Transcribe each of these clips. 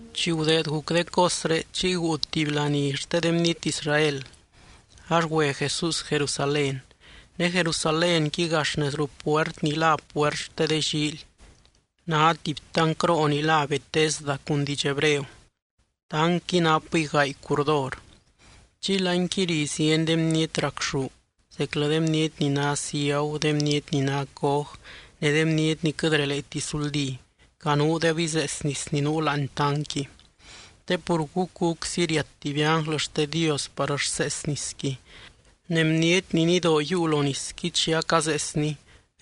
Chi gudeed guc de cosré chiy guu tuby laní xte de bniety Israel, ax güe Jesús Jerusalén. Ne Jerusalénqui gax nez ruu puert ni lá Puert xte de Llíily, ná tuby tancroo ni lá Bethesda cun diidx hebreo. Tancqui napɨy gaay curdor. Chiy láanqui ri zieny de bniety racxú, zeclɨ de bniety ni ná ciagu, de bniety ni ná coj ne de bniety ni quɨt releeti suldí, canuudeb izees nis ni nuu láani tancqui. Te pur gúc gúczy riat tuby ánglɨ xte Dios par rsees nisqui, ne bniety ni nidoo yiiu lo nisqui chi acazeesni,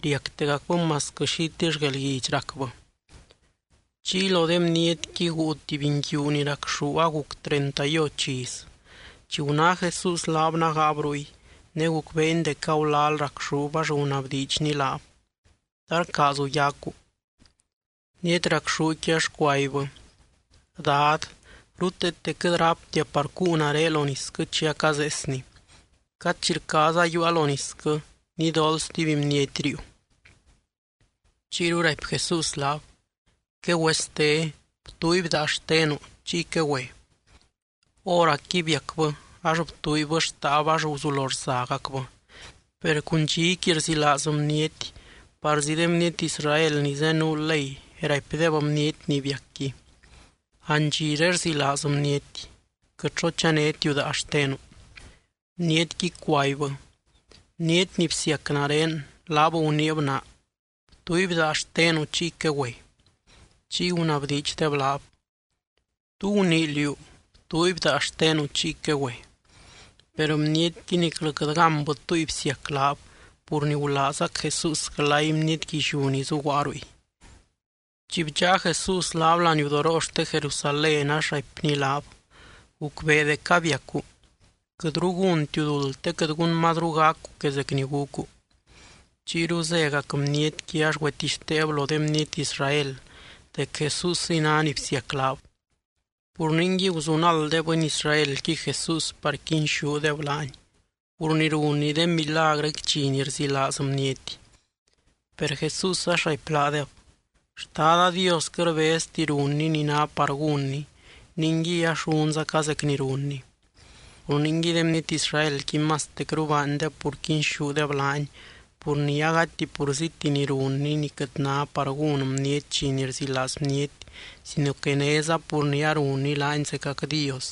riactegacbɨ masquɨ xitill guelguidx racbɨ. Chiy lo de bnietqui guu tuby nguiu ni racxú aguc treinta y och iz. Chi guná Jesús laab nágaab ruy, ne gucbeeny dec agulal racxúb ax gunabdiidxny laab: —¿Ta rcaazu yacu? Bniety racxúqui ax cuaibbɨ: —Dad, ruteete quɨt ráptia par cuu nare lo nisquɨ chi acazeesni. Cad chi rcaaza yiiua lo nisquɨ, nidool stuby bniety riiu. Chiyru raipy Jesús laab: —Quegüeste. Btuuiby daa xtenu, chiy quegüe. Hóracqui biacbɨ ax btuuibbɨ xtaab ax guzulo rzagacbɨ. Per cun dxiqui rzilaaz bniety, parzi de bniety Israel ni zenuu ley raipdeb bniety ni biacqui: —Andxiré rzilaaz bniety. Quɨt xo chanétiu daa xtenu. Bnietqui cuaibbɨ: —Bniety ni bsiac nare, laab guniib naa: “Btuuiby daa xtenu, chiy quegüe.” Chiy gunabdiidxdeb laab: —¿Tú gunii liú: “Btuuiby daa xtenu chiy quegüe”? Per bnietqui niclɨ quɨt gánbɨ túngui bsiac laab, pur ni gulaazgac Jesús glay bniety guilliú ni zuguaa ruy. Chi bdxáa Jesús laab laniudoroo xte Jerusalén ax raipny laab: —Gucbee dec abiacu. Quɨtru gúntiu duld te quɨt gun mazru gacu que zec ni gucu. Chiyru zégac bnietqui ax güetixteeb lo de bniety Israel dec Jesúsiy ná ni bsiac laab. Pur ningui, guzunald de bɨny Israelqui Jesús par quinxúdeb laany, pur ni runny de milagrɨqui dxi ni rzilaaz bniety. Per Jesús ax raipy laadeb: —Xtada Dios quɨt rbezti runny ni ná par gúnny, ningui ax runzaca zec ni runny. Pur ningui de bniety Israelqui mastecru baandeb pur quinxúdeb laany, pur ni agati purzíti ni runny ni quɨt ná par gún bniety dxi ni rzilaaz bniety, sino que néza pur ni arunny laany zecac Dios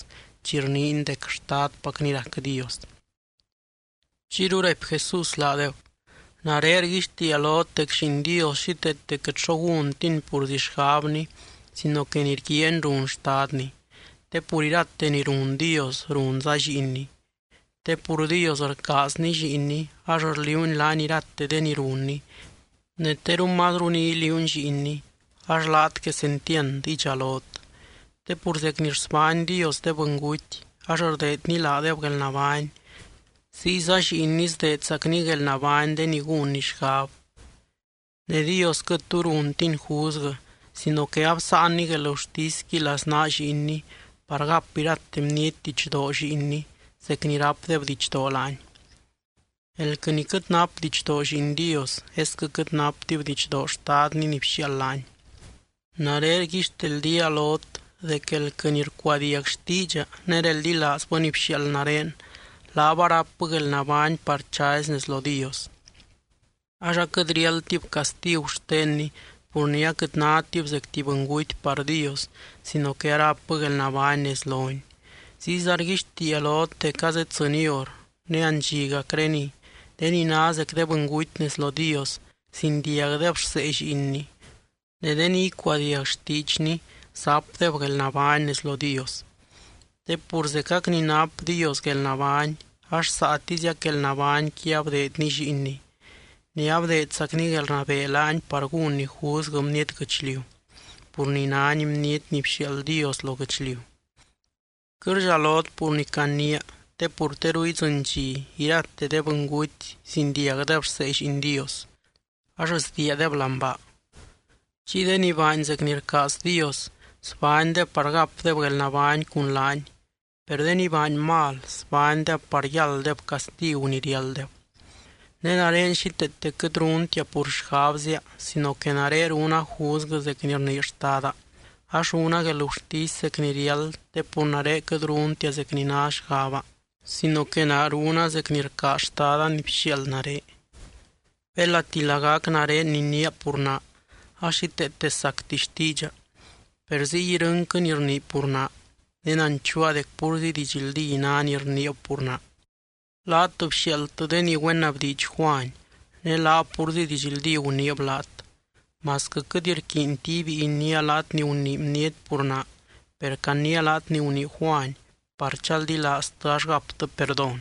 chi rniiny dec Xtadpacny rac Dios. Chiyru raipy Jesús laadeb: —Nare rguixtiia lot dec Lliin Dios xíteete quɨt xo gúntiny purzi xgabny sino que ni rguiaany run Xtadny. Te pur irate ni run Dios runza Lliinny. Te pur Dios rcaazny Lliinny ax rliuuny laany irate de ni runny, ne teru mazru ni iliuuny Lliinny ax laat quesentiand idxalot. Te pur zec ni rsbány Dios de bɨnguty ax rdeedny laadeb guelnabány, ziyza Lliinny sdeedzacny guelnabány de ni gúnny xgab. Ne Dios quɨt tu runtiny juzguɨ sino que absáanny guelgurtisqui laznaa Lliinny par gap irate bniety didxdoo Lliinny zec ni rápdeb didxdoo laany. Elquɨ ni quɨt nap didxdoo Lliin Dios esquɨ quɨt naptib didxdoo Xtadny ni bxiaald laany. ’Nare rguixteldía lot dec elquɨ ni rcuadiag xtiidxa ne reldilaazbɨ ni bxiaald nare, laab arápbɨ guelnabány par chazy nez lo Dios. Ax aquɨt riáldtib castigu xtenny pur ni aquɨt nátib zec tuby bɨnguty par Dios sino que arápbɨ guelnabány nez lony. Ziyza rguixtiia lot dec azeddzɨny hor, ne andxigacreniy, de ni ná zec de bɨnguty nez lo Dios, zindiagdeb rsee Lliinny, ne de ni icuadiag xtiidxny zapdeb guelnabány nez lo Dios. Te pur zecac ni nap Dios guelnabány ax saatiziac guelnabányqui abdeedny Lliinny. Ne abdeedzacny guelrnabee laany par gúnny juzguɨ bniety guɨchliu, pur ni nány Bniety ni bxiaald Dios lo guɨchliu. Quɨt rdxalot pur ni caniia, te pur teru idzɨny dxi irate de bɨnguty zindiagdeb rsee Lliin Dios ax sdiiadeb láani baa. Chiy de ni baany zec ni rcaaz Dios, sbánydeb par gapdeb guelnabány cun laany. Per de ni baany mal, sbánydeb par yálddeb castigu ni riálddeb. ’Ne nare xíteete quɨt runtia pur xgabzia sino que nare runa juzguɨ zec ni rnii Xtada. Ax runa guelgurtisy zec ni riáld te pur nare quɨt runtia zec ni ná xgaba sino que naa runa zec ni rcaaz Xtada ni bxiaald nare. Belati lagac nare niniia pur naa, ax xíteete sacti xtiidxa. Per ziy irɨnquɨ ni rnii pur naa, ne nanchuua dec púrzi didxldí ná ni rniib pur naa. Laat bxiaaldtɨ de ni güenabdiidx Juany, ne laab púrzi didxldí guniib laat. Masquɨ quɨt rquiinti ibíi iniia laat ni gunii bniety pur naa, per caniia laat ni gunii Juany par chaldilaaztɨ ax gaptɨ perdón.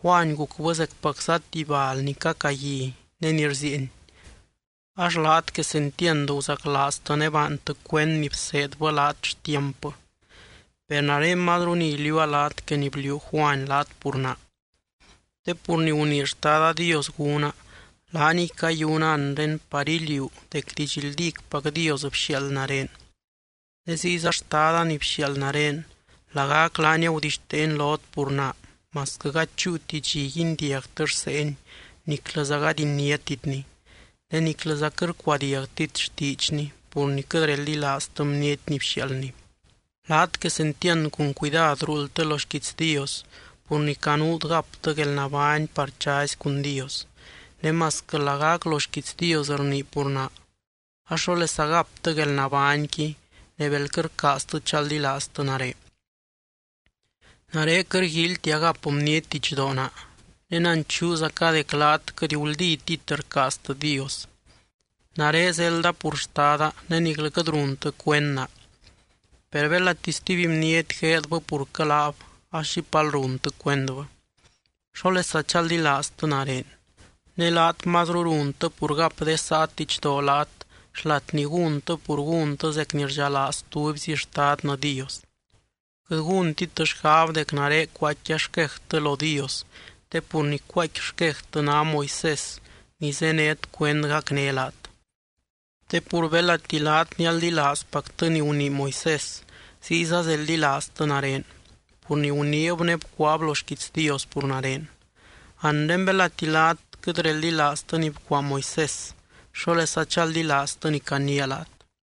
Juany gucbɨ zecpacza tuby bal ni cacagui ne ni rzieeny, ax laat quesentiand guzaclaaztɨ ne baantɨ cuend ni bseedbɨ laat xtiampbɨ. Per nare mazru ni iliuua laat que ni bliuu Juany laat pur naa. Te pur ni gunii Xtada Dios gúna, laaniy cayuna anre par iliuu dec didxldícpac Dios bxiaald nare. Ne ziyza Xtada ni bxiaald nare, lagac laany agudixteeny lot pur naa masquɨ gady chúuti dxi guindiagtɨ rseeny niclɨza gady iniátitny. Ne niclɨza quɨt rcuadiagtit xtiidxny pur ni quɨt reldilaaztɨ bniety ni bxiaaldny. Laat quesentiand cun cuidad ruuldtɨ lo xquiits Dios pur ni canuut gaptɨ guelnabány par chazy cun Dios. Ne masquɨ lagac lo xquiits Dios rnii pur naa ax, ¿xólesa gaptɨ guelnabányqui ne bel quɨt rcaaztɨ chaldilaaztɨ nare? ’Nare quɨt rguíilytia gap bniety didxdoo naa. Ne nanchuuzaca dec laat quɨt guldítit rcaaztɨ Dios. Nare zelda pur Xtada ne niclɨ quɨt runtɨ cuend naa. Per belati stuby bniety gueedbɨ purquɨ laab ax xipal runtɨ cuendbɨ. ¿Xólesa chaldilaaztɨ nare? Ne laat mazru runtɨ pur gap de saat didxdoo laat xlat ni gúntɨ pur gúntɨ zec ni rdxalaaz tubyzi Xtadnɨ Dios. Quɨt gúntit xgab dec nare cuaaicquia xquejtɨ lo Dios te pur ni cuaaicqui xquejtɨ ná Moisés ni zénet cuend gacné laat. Te pur belati laat nialdilaazpactɨ ni gunii Moisés, ziyza zeldilaaztɨ nare, pur ni guniib ne bcuaab lo xquiits Dios pur nare. Anre belati laat quɨt reldilaaztɨ ni bcuaa Moisés, ¿xólesa chaldilaaztɨ ni caniia laat?